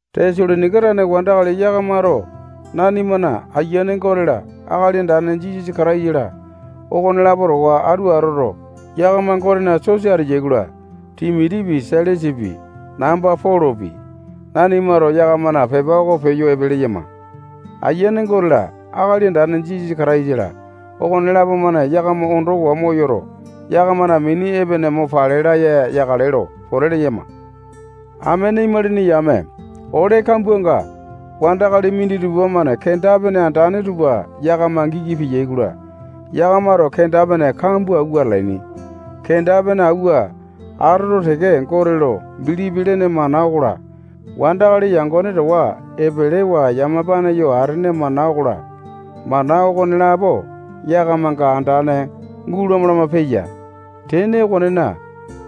Tesalonaika tane wandakali yakamato nanimana Ayiane Gote-la, Akali Andane Jisasa Kataisa-la, okonelapo towa atu atoto, yakama Gotena sosa ateyai-kola, Timotipi, Sailasapi, namba Polopi, nanimato yakamana pepa oko peyo epe leyama. Ayiane Gote-la, Akali Andane Jisasa Kataisa-la, okonelapo-mane yakama ondowa moyoto, yakamana mini epene mo pale laya yakale lo pote leyama. Amene imalini yame, ole kambuanga wandakali minditupa-mane kenda-pene andane tupa yakama giki peyai-kola, yakamato kenda-pene kambua awua atalaini. Kenda-pene auwa atoto teke, Gote lo bilipi lene mana okola, wandakali yangone towa epelewa yamapa yoo atene mana okola, mana okonelapo yakamanga andane gulama lama peya. Tene okonena,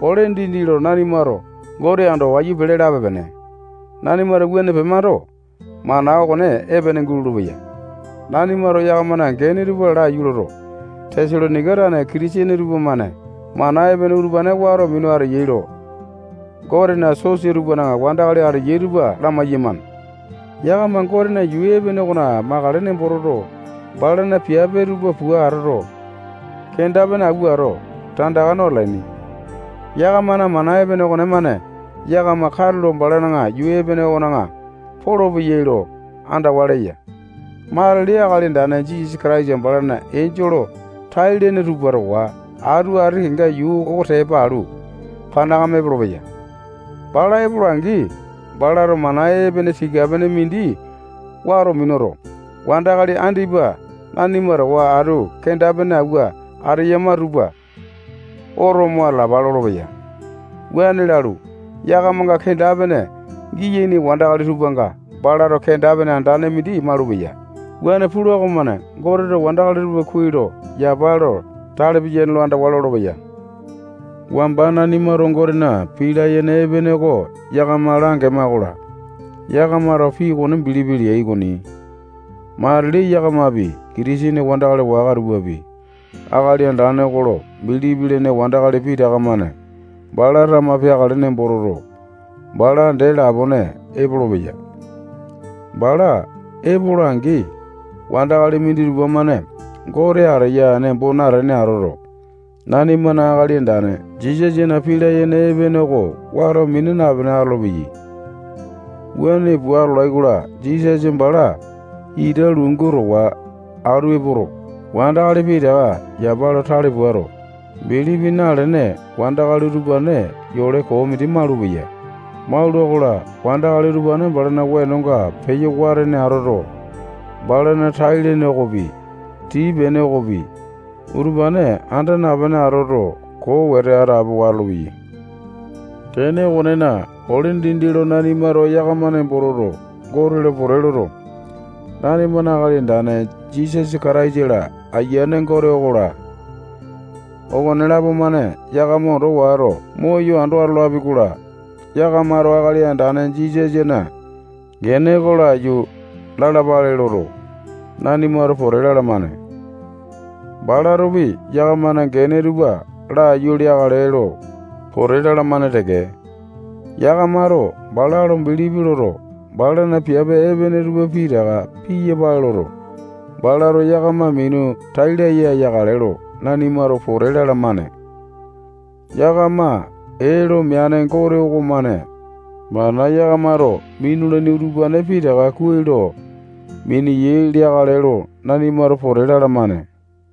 ole dindi lo nanimato Gote ando wayu pele lape-pene. Nanimato wuane pemando, mana okone epene gulolo-peya. Nanimato yakamana gene tupa laiyu loto, Tesalonaika tane Kitisene tupamane mana epene utupane wato minu ateyai lo Gotena sosa tupana wandakali ateyai tupa lamai-yamane. Yakama Gotena yuu epene okona makale nembo toto, balana piape tupa pua atoto, kenda-pene awuato, tandaka no atalaini. Yakamana mana epene okonemane yakama katulo balana yuu epene okona polopeyai lo andawa leya. Matili Akali Andane Jisasa balana enjole tai-lene tupa towa atu ati kenga yuu oko tepa alu, panakame epolopeya. Bala epola-angi, balato mana epene tika-pene mindi wato minuto, wandakali andipa nanima towa atu kenda-pene awua ateyama tupa oto mo atalapa lolopeya. Wuane lalu, yakamanga kenda-pene giyaini wandakali tupanga balato kenda-pene andane mindi malupeya. Wuane pula okomane Goteto wandakali tupa kuai lo yapa lo tale piyane lo andawa lolopeya. Wamba nanimato Gotena pii layene epene oko yakama langema-kola, yakamato pii okone bilipi leai okoni. Matili yakamapi, Kitisene wandakali waka tupapi, Akali Andane oko lo bilipi lene wandakali pitaka-mane bala tama peakale nembo toto, bala dee lapone epolopeya. Bala epola-angi, wandakali minditupa-mane Gote ateya nembo natene atoto, nanimana Akali Andane Jisasana pii layene epene oko wato mina napene atolopeyai. Wuane pua atolai-kola, Jisasa bala ita lungu towa atu epoto, wandakali pitaka yapa lo tale puato, bilipi nalene wandakali utupane yole koo mindi malupeya. Maula-kola, wandakali utupane balana wenonga peyo watene atoto, balana tai-lene okopi, tii-pene okopi, utupane anda napene atoto, koo wete atapowa atolopeyai. Tene okonena, ole dindi lo nanimato yakama nembo toto, Gote lo pote loto, nanimana Akali Andane Jisasa Kataisa-la, Ayiane Gote okola, okonelapo-mane yakama ondo wato, moyo ando atolapi-kola, yakamato Akali Andane Jisasana gene oko laiyu lalapale loto, nanimato pote lalamane. Balatopi yakamana gene tupa laiyu leakale lo pote lalamane teke. Yakamato bala lo bilipi loto, balana piape epene tupa pitaka piyapale loto, balato yakama minu tai laya yakale lo nanimato pote lalamane. Yakama ee lo meane Gote okomane mana yakamato minulaini utupane pitaka kuai lo mineyai leakale lo nanimato pote lalamane.